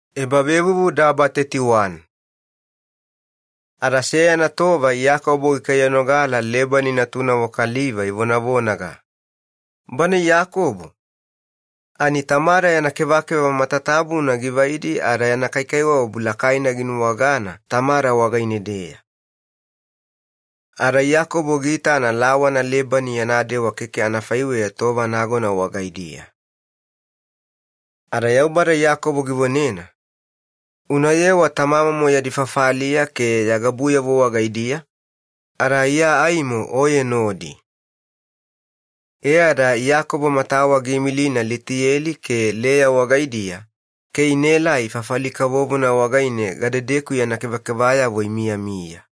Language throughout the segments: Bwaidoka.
Iyakobo giota Lebani wagaine-deya. Ada seyana tova Iyakobo gikaiyanogala Lebani natunavo kaliva ivonavonaga, “Bana Iyakobo ani tamada yana kevakeva matatabuna givaidi ada yana kaikaiwabu lakaina ginuwagana tamada wagaine-deya.” Ada Iyakobo giitana lawana Lebani yana dewa keke anafaiweya tova nagona wagaidiya. Ada Yaubada Iyakobo givonena, “Unayewa tamamomo yadi fafaliya ke ya gabuyavo wagaidiya, ada Iya aimo oye nodi.” E ada Iyakobo matawa giimilina Litiyeli ke Leya wagaidiya inaelai fafali kavovona wagaine yana kevakevayavo imiyamiya,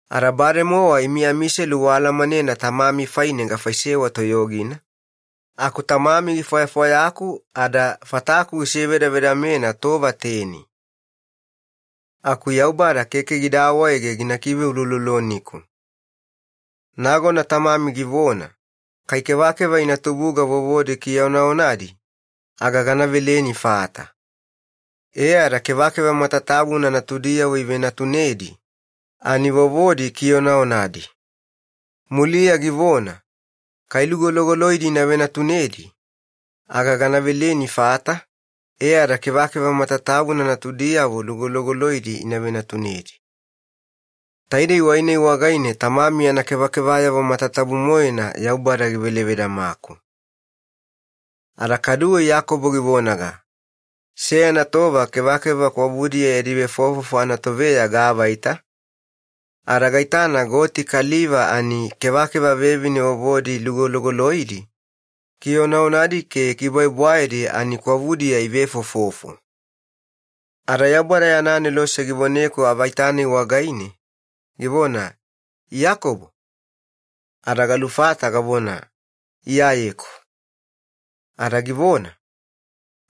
Ada bademowa imi amiselu waalamanena tamami faine gafaisewa toyogina, aku tamami gifwayafwayaku ada fataku gisivedavedamena tova teni. Aku Yaubada keke gida awaege gina kiveulouloloniku. Nagona tamami givona, ‘Kai kevakeva ina tubuga vovodi kionaonadi aga gana veleni fata,’ e ada kevakeva matatabuna natudiyavo ivenatunedi ani vovodi kionaonadi. Muliya givona, ‘Kai lugologoloidi ina venatunedi aga gana veleni fata,’ e ada kevakeva matatabuna natudiyavo lugologoloidi ivenatunedi. Taidei wai-nai wagaine tamami yana kevakevayavo matatabu-moena Yaubada givelevedamaku.” Ada kaduwe Iyakobo givonaga, “Seyana tova kevakeva kwavudiya yadi vefofofo anatoveya gaavaita, ada gaitana goti kaliva ani kevakeva vevine vovodi lugologoloidi, kionaonadi ke bwaebwaedi ani kwavudiya ivefofofo. Ada Yaubada yana anelose givoneku avaita-nai wagaine, givona, ‘Iyakobo!’ Ada galufata gavona, ‘Iyayeku.’ Ada givona,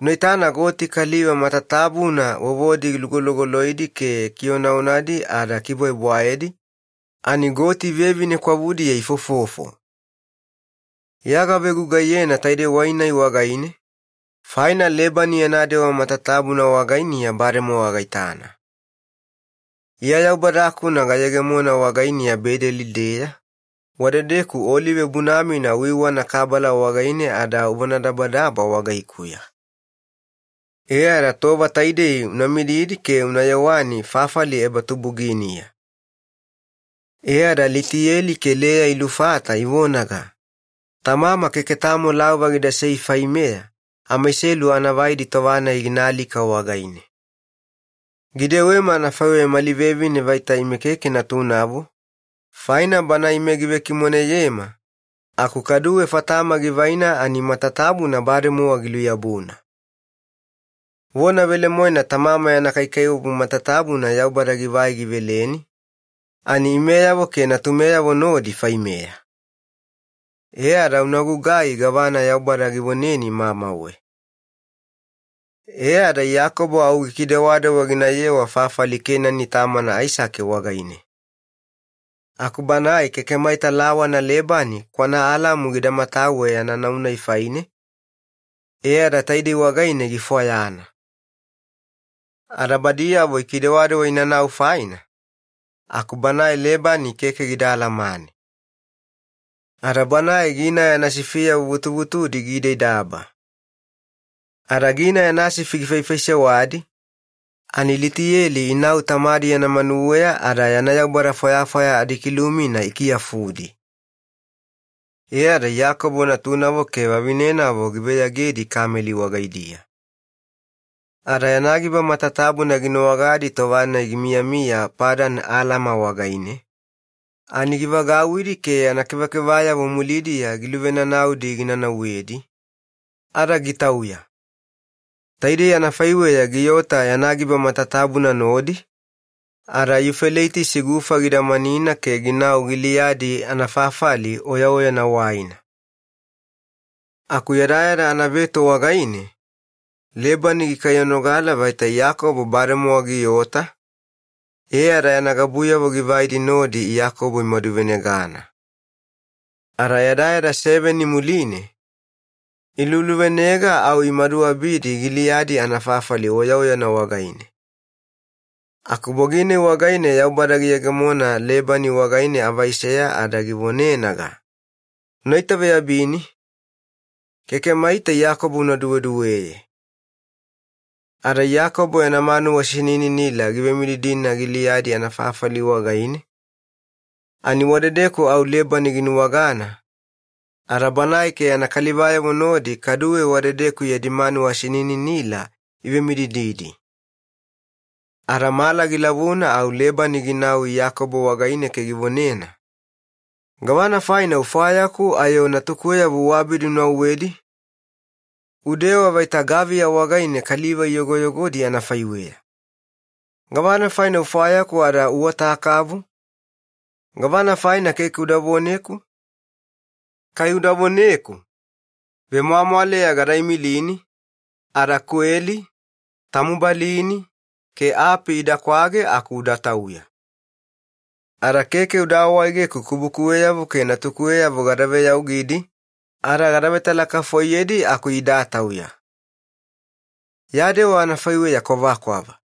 ‘Unaitana goti kaliva matatabuna vovodi lugolugoloidi ke kionaonadi ada bwaebwaedi ani goti vevine kwavudiya ifofofo. Iya gavegugaiyena taidei wai-nai wagaine faina Lebani yana dewa matatabuna wagainiya bademowa gaitana. Iya Yaubada-kuna gayegemona wagainiya Bedeli-deya, wadedeku olive bunamina wagaine kabala uiwavetabuna ada uvonadabadaba wagaikuya. E ada tova taidei una mididi ke una yewani fafali ebatubuginiya.’” E ada Litiyeli ke Leya ilufata ivonaga, “Tamama keke tamo laova gidasei faimeya amaiselu anavaidi tova-nai ginaalika wagaine. Gidewema anafaiweya mali vevine vaita ime keke natunavo, faina bana ime givekimoneyema aku kaduwe fatama givaina ani matatabuna bademowa giluyabuna. Vona velemoena tamama yana kaikaiwabu matatabuna Yaubada givai giveleni, imeyavo ke natumeyavo nodi faimeya. E ada unagugai gavana Yaubada givoneni mamauwe.” E ada Iyakobo au gikidewadewa ginayewa fafali Kenani tamana Aisake wagaine. Aku banae keke maita lawana Lebani kwanaAlami gida matawe yana nau-nai faine, ke taidei wagaine gifwayana. Ada badiyavo ikidewadewa inanau faina aku banae Lebani keke gida alamana ada gina yana sifiyavo vutuvutudi giidaidaba. Ada ginau yana sifi gifaifaisewadi ani Litiyeli ina tamadi yana manuweya ada yana kilumina ikiyafudi. E ada Iyakobo natunavo ada vavinenavo giveyagedi kameli wagaidiya. Ada yana giba matatabuna ginuwagadi tova-nai gimiyamiya Padan Alama wagaine ani givagauwidi ke yana kevakevayavo mulidiya givagavenanaudi gina nauwedi, ada gitauya. Taidei anafaiweya giota yana giba matatabuna nodi, ada Yufeleitisi Gufa gidamanina ke ginau Giliyadi anafafali oyaoyana waina. Aku yadayada anaveto wagaine Lebani gikaiyanogala vaita Iyakobo bademowa giota, ada yana gabuyavo givaidi nodi Iyakobo imaduvenegana. Ada yadayada seveni muline iluluvenega au imaduabidi Giliyadi anafafali oyaoyana wagaine. Aku bogi-nai wagaine Yaubada giyegemona Lebani wagaine avaiseya ada givonenaga, “Unaitaveyabini, keke maita Iyakobo una duweduweye.” Ada Iyakobo yana manuwa sinininila givemididina Giliyadi anafafali wagaine, ani wadedeku au Lebani ginuwagana, ada banae ke yana kalivayavo nodi kaduwe wadedeku yadi manuwa sinininila ivemididina. Ada mala gilavuna au Lebani ginau Iyakobo wagaine ke givonena, “Gavana faina ufwayaku ayo natukuweyavo uabidi unauwedi? Udewa vaita gaviya wagaine kaliva iyogoyogodi anafaiweya. Gavana faina ufwayaku ada uota kavu? Gavana faina keke uda voneku? Kai uda voneku, vemwamwaleya gada imilini, kweli ke anafaiweya tamubalini ke api idakwage aku udatauya. Ada keke uda awaegeku kubukuweyavo ke natukuweyavo gada veyaugidi ada gada vetalakafoiyedi aku idatauya. Ya dewa anafaiweya kwavakwava.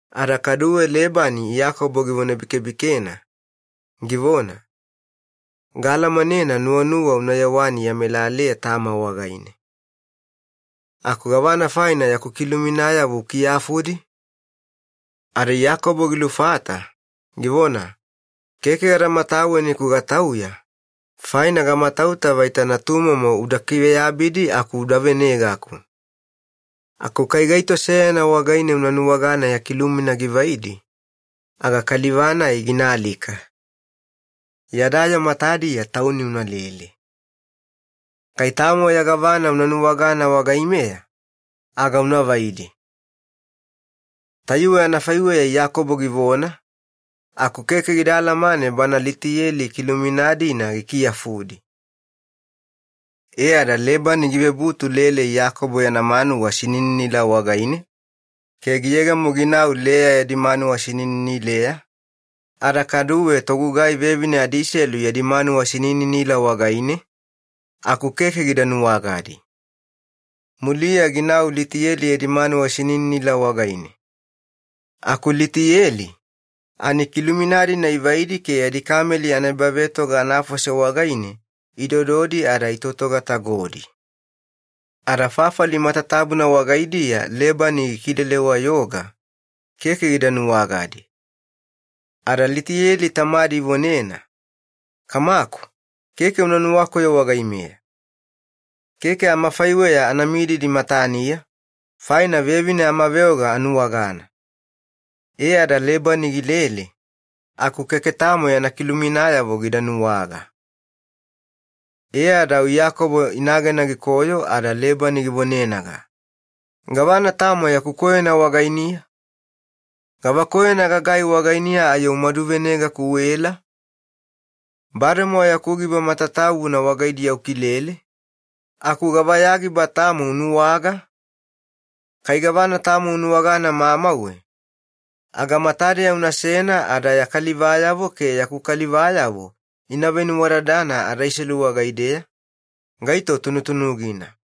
Ada kaduwe givonebikebikena, givona, “Gaalamanena nuwanuwa una yewani ya melaleya tama wagaine. Aku gavana faina yaku kiluminayavo ukiyafudi?” Ada Iyakobo gilufata, givona, “Keke gada mataweni-ku gatauya faina gamatauta vaita natumomo uda kiveyabidi aku uda venegaku. Aku kai gaito seyana wagaine una nuwagana ya kilumina givaidi aga kaliva-nai ginaalika. Yada yoo matadiya tauni unalele, kai tamo ya gavana una nuwagana wagaimeya aga unavaidi.” Tayuwe anafaiweya Iyakobo givona, aku keke gida alamane bana Litiyeli kilumina-dina gikiyafudi. E ada Lebani givebutu lele Iyakobo yana manuwa sinininila wagaine ke giyegemo ginau Leya yadi manuwa sinininileya ada kaduwe togugai vevine adiselu wagaidiya, aku keke gida nuwagadi. Muliya ginau Litiyeli yadi manuwa sinininila wagaine. Aku Litiyeli ani kilumina-dina ivaidi ada yadi kameli anaebavetoga anafose wagaine idododi ada itotogatagodi, aku fafali matatabuna wagaidiya Lebani gikilele-wayoga, keke gida nuwagadi. Ada Litiyeli tamadi ivonena, “Kamaku, keke una nuwakoyo wagaimeya. Keke amafaiweya ana mididi mataniya faina vevine amaveoga anuwagana.” E ada Lebani gilele aku keke tamo yana kiluminayavo gida nuwaga. E ada au Iyakobo inagena gikoyo, ada Lebani givonenaga, “Gavana tamo yaku koyona wagainiya? Gava koyona gagai wagainiya ayo umaduvenegaku uela? Bademowa yaku giba matatabuna wagaidiya ukilele, aku gava ya giba tamo unuwaga? Kai gavana tamo unuwagana mamauwe aga matadeya unasena ada ya kalivayavo ke yaku kalivayavo ina venuwadadana adaiselu wagaideya gaito tunutunugina.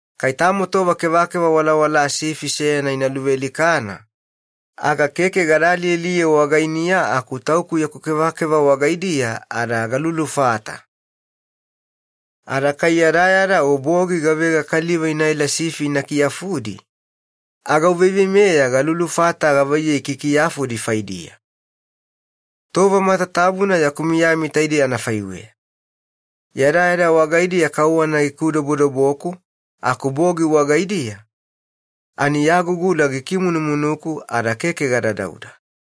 Kai tamo tova kevakeva walawalaa sifi seyana ina luvealikana aga keke gada alialiye wagainiya, aku tauku yaku kevakeva wagaidiya ada galulufata. Ada kai yadayada o bogi gavega kaliva inaela sifi ina kiyafudi aga uveiveimeya galulufata gavaiyei kiyakiyafudi faidiya. Tova matatabuna yaku miyami taidei anafaiweya, yadayada wagaidiya kauwana gikufuwafuwaku aku bogi wagaidiya ani yagugula gikimunumunuku ada keke gadadauda.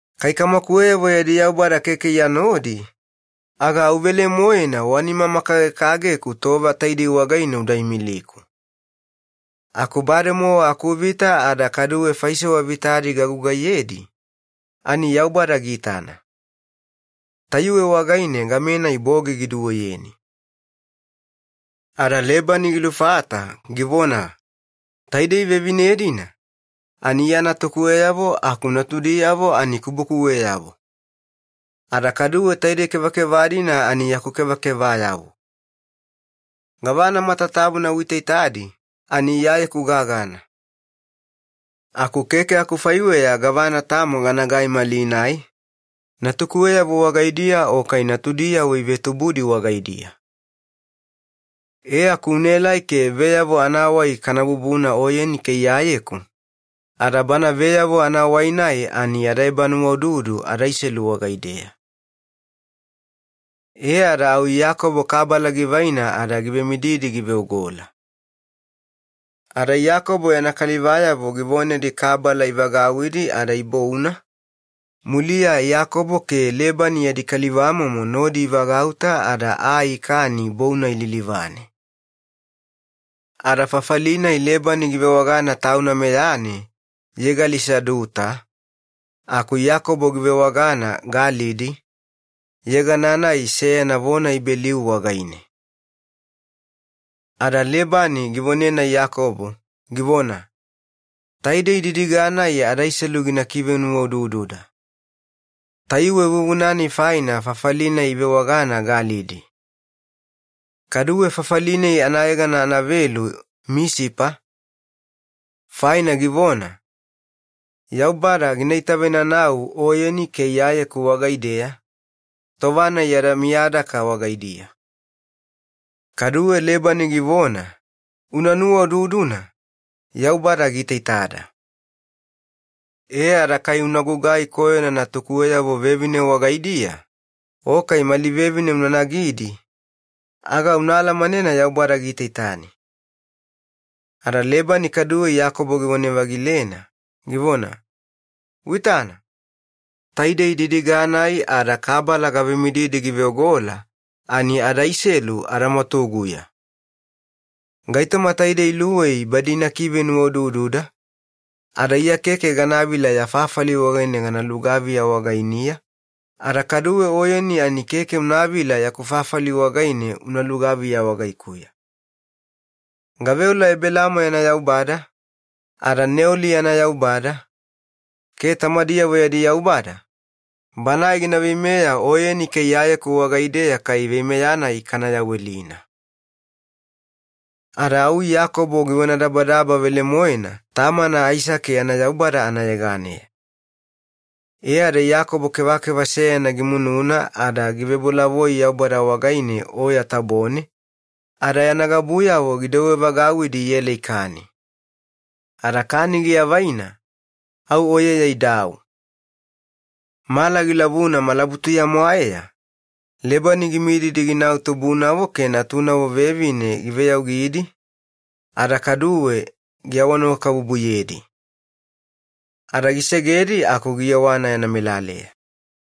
Kai kamakuweyavo yadi Yaubada keke iya nodi, aga au velemoena nima-makagekageku tova taidei wagaine uda imiliku. Aku bademowa akuvita ada kaduwe faisewa vitadi gagugaiyedi ani Yaubada giitana. Tayuwe wagaine gamenai bogi giduweyeni.” Ada Lebani gilufata, givona, “Taidei vevine-dina ani iya natukuweyavo aku natudiyavo kubukuweyavo, ada kaduwe taidei kevakeva-dina yaku kevakevayavo. Gavana matatabuna uitaitadi ani iyayeku gagana. Aku keke akufaiweya gavana tamo ganagai malinai, natukuweyavo wagaidiya o kai natudiyavo ivetubudi wagaidiya. E aku unaelai ke veyavo anavonadabadaba kana bubuna oyeni ke iyayeku, ada bana gaitoma-nai yada ebanuwaududu adaiselu wagaideya.” E ada au Iyakobo kabala givaina ada givemididi giveogola. Ada Iyakobo yana kalivayavo givonedi kabala ivagauwidi ada ibouna, muliya Iyakobo ke Lebani yadi kalivamomo nodi ivagauta aa ikani bou-nai lilivane. Ada fafali-nai Lebani givewagana tauna meyane Yegali-Saaduta, aku Iyakobo givewagana Galidi, yegana-nai seyana vona Ibeliu wagaine. Ada Lebani givonena Iyakobo, givona, “Taidei didiga-nai adaiselu gina kivenuwaudududa.” Tayuwe vuvuna-nai faina fafali-nai ivewagana Galidi. Kaduwe fafali-nai anayegana anavelu Misipa, faina givona, “Meyameyaganina Yaubada gina itavenanau oyeni ke iyayeku wagaideya, tova-nai yada miyadaka wagaidiya.” Kaduwe Lebani givona, “Una nuwaududuna, Yaubada giitaitada ada kai unagugai koyona natukuweyavo vevine wagaidiya o kai mali vevine una nagidi aga una alamanena Yaubada giitaitani.” Ada Lebani kaduwe Iyakobo givone-vagilena, givona, “Uitana, taidei didiga-nai ada kabala gavemididi giveogola ani adaiselu adamwatuguya. Gaitoma taidei luwei badi ina kivenuwaudududa, ada iya keke ganavila ya fafali wagaine gana lugaviya wagainiya, ada kaduwe oyeni ani keke unavila yaku fafali wagaine una lugaviya wagaikuya. Gaveola Ebelaamo yana Yaubada, ada Neoli yana Yaubada, ke tamadiyavo yadi Yaubada, Banae gina veimeya oyeni ke iyayeku wagaideya kai veimeya kana yawelina.” Ada au Iyakobo givonadabadaba velemoena tamana Aisake yana Yaubada anayeganeya. E ada Iyakobo kevakeva seyana gimununa ada givebolavoi Yaubada wagaine oya tabone, ada yana gabuyavo gidouwevagauwidi iela ikani, ada kani giavaina muline au oyeya idau. Mala gilavuna malabutuya mwaeya Lebani gimididi ginau tubunavo ke natunavo vevine giveyaugidi, ada kaduwe giawanuwakabubuyedi. Ada gisegedi aku giyewana yana melaleya.